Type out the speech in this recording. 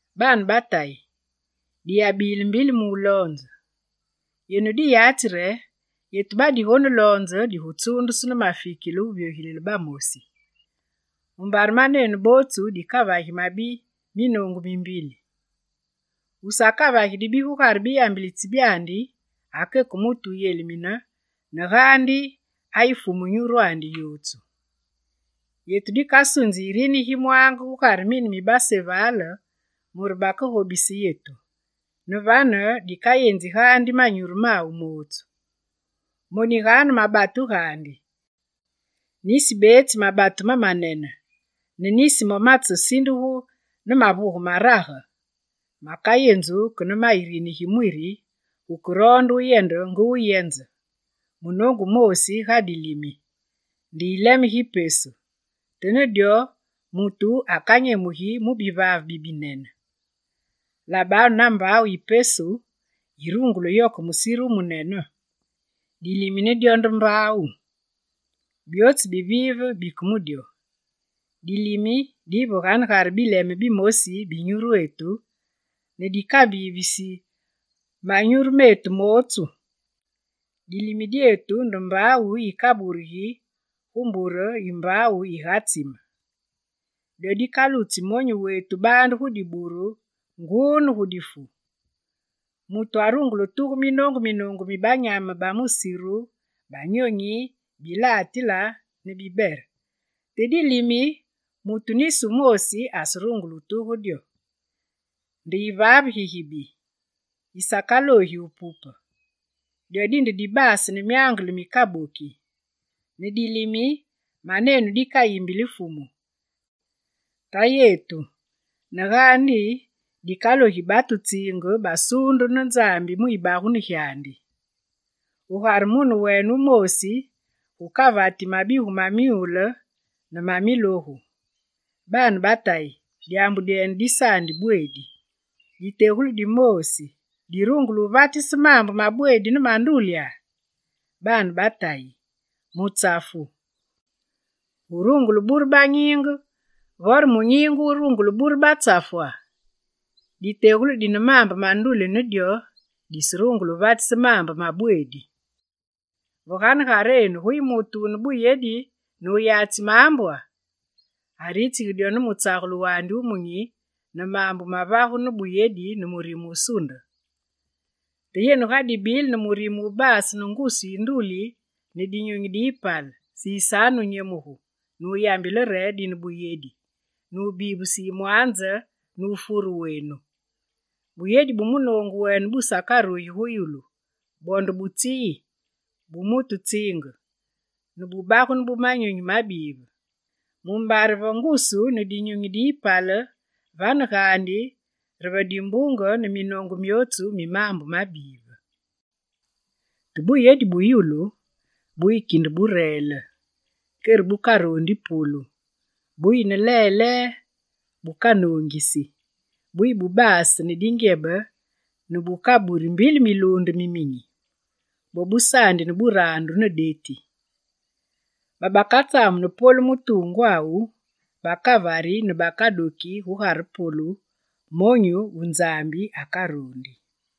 Baane ba Tayi, diyabile mbili mu wuloonze; yenu diyatsi re: yetu badigoneloonze digutsuundusu ne mafikile wuvyogilile bamosi. Mumbare manenu bootsu dikavagi mabi minoongu mi mbili. Wusakavagi dibi gugare biyambilitsi byandi, akeke mutu wuyelimine ne gaandi ayi fumu nyurwandi yootsu. Yetu dikasunzi irini gi mwaange gugare mine mi basevale mure bakegobise yetu, ne vane dikayenzi gaandi manyuru mawu mootsu. Moniganu mabatu gaandi: nisi beetsi mabatu mamanene ne nisi mo matsesindugu ne mavuge marage, makayenzu ke ne ma irini gi mwiri gukeroonde wuyende nge wuyenze. Munoongu wumoosi ga dilimi: nde yileme gi pesu, te ne dyo, mutu akanyemugi mu bivaave bibinene. Labanu na mbaawu yi pesu, yirungule wuyoke munene musiru! Dilimi ne dyo nde mbaawu: byootsu bibive bike mu dyo. Dilimi diyi ve ganegare bileme bimosi bi nyurwetu ne dikabivisi manyuru metu mootsu. Dilimi dyetu nde mbaawu yikaburugi gu mbure yi mbaawu yigatsime. Dyo dikalutsi monyu wetu baande gu diburulu nguu ne gu difu. Mutu arungule wutuge minoongu minoongu mi banyame ba musiru, banyonyi, bilatile, bibere. Te dilimi, mutu nisi wumoosi aserungule wutuge dyo. Nde yivaave gigibi, gisakaloogi wupupe. Dyo dinde dibaase ne myangele mikaboki. Ne dilimi, manenu dikayimbili Fumu, Tayetu, ne gaandi dikalogi batu tsiinge basuundu ne Nzambi mu yibagunu gyandi. Gugare mune wene wumoosi gukavati mabigu ma myule ne ma milogu; baane ba Tayi, dyaambu dyene disabweedi. Ditegulu dimoosi dirungule wuvatise maambe ma bweedi ne ma ndulya? Baane ba Tayi, mutsafu wurungule wubure banyiinge, vore munyiinge wurungule wubure batsafwa? Ditegulu dine maambe ma nduli ne dyo diserungule wuvatise maambe ma bweedi. Ve ganegarenu guyi mutu wune buyedi ne wuyatsi maambwa? Aritsigi dyo ne mutsagulu wandi wumunyi, ne maambu mavagu ne buyedi ne murime wusunde. Te yenu ga dibile ne murime wubaase ngusu yi nduli ne dinyunyi diyipale, sisanu wunyemuge nuyambile re: «Dine buyedi», nubivise yimwanze ne wufure wenu. Buyedi bu munoongu wene busakarugi gu yulu, bwo nde bu tsi yi, bu mutu tsiinge, ne bubagunu bu manyunyi mabive. Mumbare va ngusu ne dinyunyi diyipale, vane gaandi re va dimbunge ne minoongu myootsu mi maambu mabive. Te buyedi bu yulu buyi kinde bureele, kere bukaroondi polu, buyi ne lelee, bukanoongisi, buyi bubaase ne dingyebe ne bukaburi mbili miluunde miminyi. Bwo busaandi ne buraandu ne deti. Babakatsamuni polu mu tuungwawu bakavari ne bakadoki gugare polu, monyu wu Nzambi akaroondi.